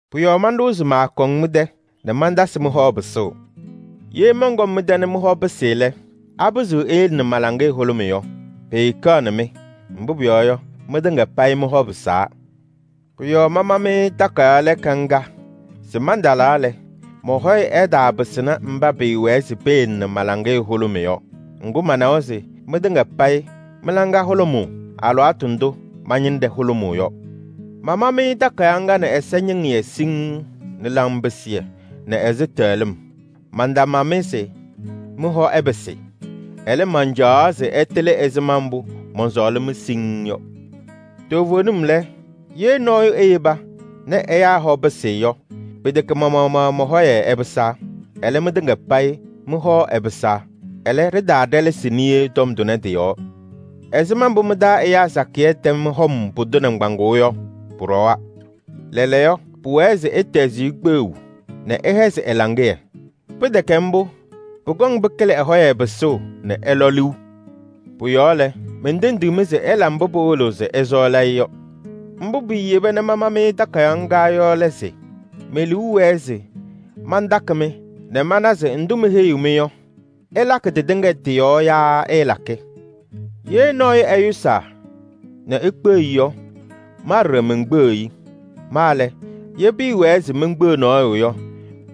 Pʋ-yɔɔ manɖʋwa se maakɔŋ mɩ-tɛ nɛ mantasɩ mɩ-hɔ pɩsʋʋ. Ye mɔnkɔm mɩ-tɛ nɛ mɩ-hɔ pɩsɩ lɛ, apɩzɩɣ eyele nɛ ma-laŋɩyɛ hʋlʋmɩ yɔ? Pɩɩkɛɣnɩ mɩ! Mbʋ pʋyɔɔ yɔ, mɩtɩŋa payɩ mɩ-hɔ pɩsaa. Pʋ-yɔɔ mama-mɩ takayaɣ lɛɛka ŋga se mantalaa lɛ, mɔ-hɔyɛ ɛtaapɩsɩnɩ mba pɩɩwɛɛ se peyele ma-laŋɩyɛ hʋlʋmɩ yɔ. Ŋgʋ, manawa se mɩtɩŋa payɩ mɩ-laŋa hʋlʋmʋʋ alɩwaatʋ ndʋ ma-ñɩnɖɛ hʋlʋmʋʋ yɔ. Mama-mɩ takayaɣ ŋga nɛ ɛsɛñɩŋɩyɛ siŋŋ nɛ laŋpɩsɩyɛ nɛ ɛzɩtɛɣlɩm. Mantama-mɩ se mɩ-hɔ ɛpɩsɩ. Ɛlɛ, mancaɣaɣ se ɩtɩlɩ ɛzɩma mbʋ mɔnsɔɔlɩ-mɩ siŋŋ yɔ. Toovenim lɛ, ye nɔɔyʋ eyeba nɛ ɛyaa hɔ pɩsɩ yɔ, pɩtɛkɛ ma-maɣmaɣ mɔ-hɔyɛ ɛpɩsaa. Ɛlɛ, mɩtɩŋa payɩ mɩ-hɔ ɛpɩsaa. Yaa pʋcɔ mantaaɖɛlɛsɩ niye lɛ, mɩ-taa nabɛyɛ hɔ ɛpɩsaa. Ɛzɩma mbʋ mɩ-taa ɛyaa sakɩyɛ tɛm hɔm pʋdʋ nɩŋgbaŋʋʋ yɔ, pʋɖɔwa. Lɛɛlɛɛyɔ, pʋwɛɛ se ɩtɛzɩ-ɩ kpeɣu nɛ ɩhɛzɩ ɛ-laŋɩyɛ. Pɩtɛkɛ mbʋ, pʋkɔŋ pɩkɩlɩ ɛ-hɔyɛ pɩsʋʋ nɛ ɛlɔ liu. Pʋ-yɔɔ lɛ, mentendiɣ-mɩ se ɩla mbʋ pɩwɩlɩɣ se ɩsɔɔlɩ-ɩ yɔ. Mbʋ piiyeba nɛ mama-mɩ takayaɣ ŋga yɔ lɛ se: me-liu wɛɛ se mantakɩ-mɩ nɛ mana se ndʋ meheyiɣ-mɩ yɔ, ɩlakɩ tɩtɩŋa tɩ-yɔɔ yaa ɩɩlakɩ. Ye nɔɔyʋ ɛyʋsaa nɛ ikpeɣ-i yɔ, ma ɖɔɖɔ menkpeɣiɣ-i. Ma lɛ, ye pɩɩwɛɛ se menkpeɣ nɔɔyʋ yɔ,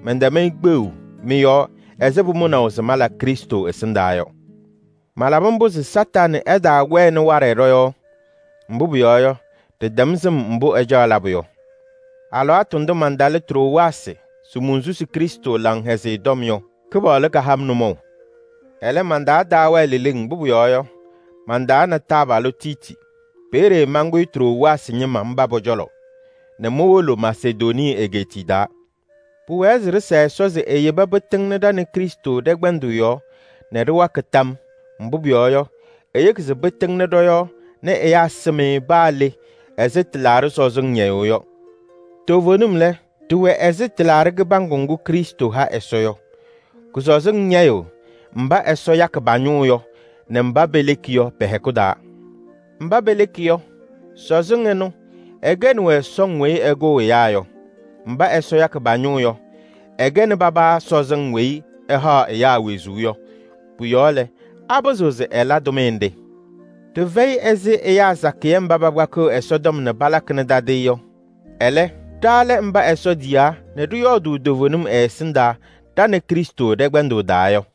mɛntɛm-ɩ kpeɣu mɩ-yɔɔ ɛzɩ pʋmʋnaʋ se mala Krɩstʋ ɛsɩndaa yɔ. Malabɩ mbʋ se Kañadʋ Satanɩ ɛtaawɛnɩ waɖɛ ɖɔ-yɔɔ. Mbʋ pʋyɔɔ yɔ, ɖɩtɛm sɩm mbʋ ɛcaɣ labʋ yɔ. Alɩwaatʋ ndʋ mantalɩ Trowaasɩ se monsusuu Krɩstʋ Laŋhɛzɩyɛ Tɔm yɔ, Kɩpaɣlʋ kaha-m nʋmɔʋ. Ɛlɛ, man-taa taawɛɛ leleŋ, mbʋ pʋyɔɔ yɔ, mantaana taabalʋ Tiiti. Peeye mankʋyɩ Trowaasɩ ñɩma mba pɔ-cɔlɔ nɛ mowolo Masedonii egeetiye taa. Pʋwɛɛ se ɖɩsa Ɛsɔ se eyeba pɩtɩŋna ɖa nɛ Krɩstʋ ɖɛ-kpɛndʋʋ yɔɔ nɛ ɖɩwakɩ tam. Mbʋ pʋyɔɔ yɔ, eyeki se pɩtɩŋnɩ ɖɔ-yɔɔ nɛ ɛyaa sɩm-ɩ paa le ɛzɩ tɩlaaɖɩ sɔzɩŋ ñɛyʋʋ yɔ. Toovenim lɛ, ɖɩwɛ ɛzɩ tɩlaaɖɩ kɩbaŋgʋ ŋgʋ Krɩstʋ ha Ɛsɔ yɔ. Kʋ-sɔzɩŋ ñɛyɩɣ mba Ɛsɔ yakɩ pa-ñʋʋ yɔ nɛ mba peleki yɔ pɛ-hɛkʋ taa. Mba peleki yɔ, sɔzɩŋ ɛnʋ ɛkɛnɩ-wɛ sɔŋ weyi ɛkʋʋ ɛyaa yɔ. Mba Ɛsɔ yakɩ pa-ñʋʋ yɔ, ɛkɛnɩ paba sɔzɩŋ weyi ɛhaɣ ɛyaa wezuu yɔ. Pʋ-yɔɔ lɛ, apɩzɩɣ se ɛla tʋmɩyɛ nɖɩ? Ɖɩfɛyɩ ɛzɩ ɛyaa sakɩyɛ mba pakpakɩɣ Ɛsɔtɔm nɛ palakɩnɩ tadɩyɛ yɔ. Ɛlɛ, ɖa lɛ mba Ɛsɔ tiyaa nɛ ɖɩyɔɔdʋʋ toovenim ɛ-ɛsɩndaa ɖa nɛ Krɩstʋ ɖɛ-kpɛndʋʋ taa yɔ.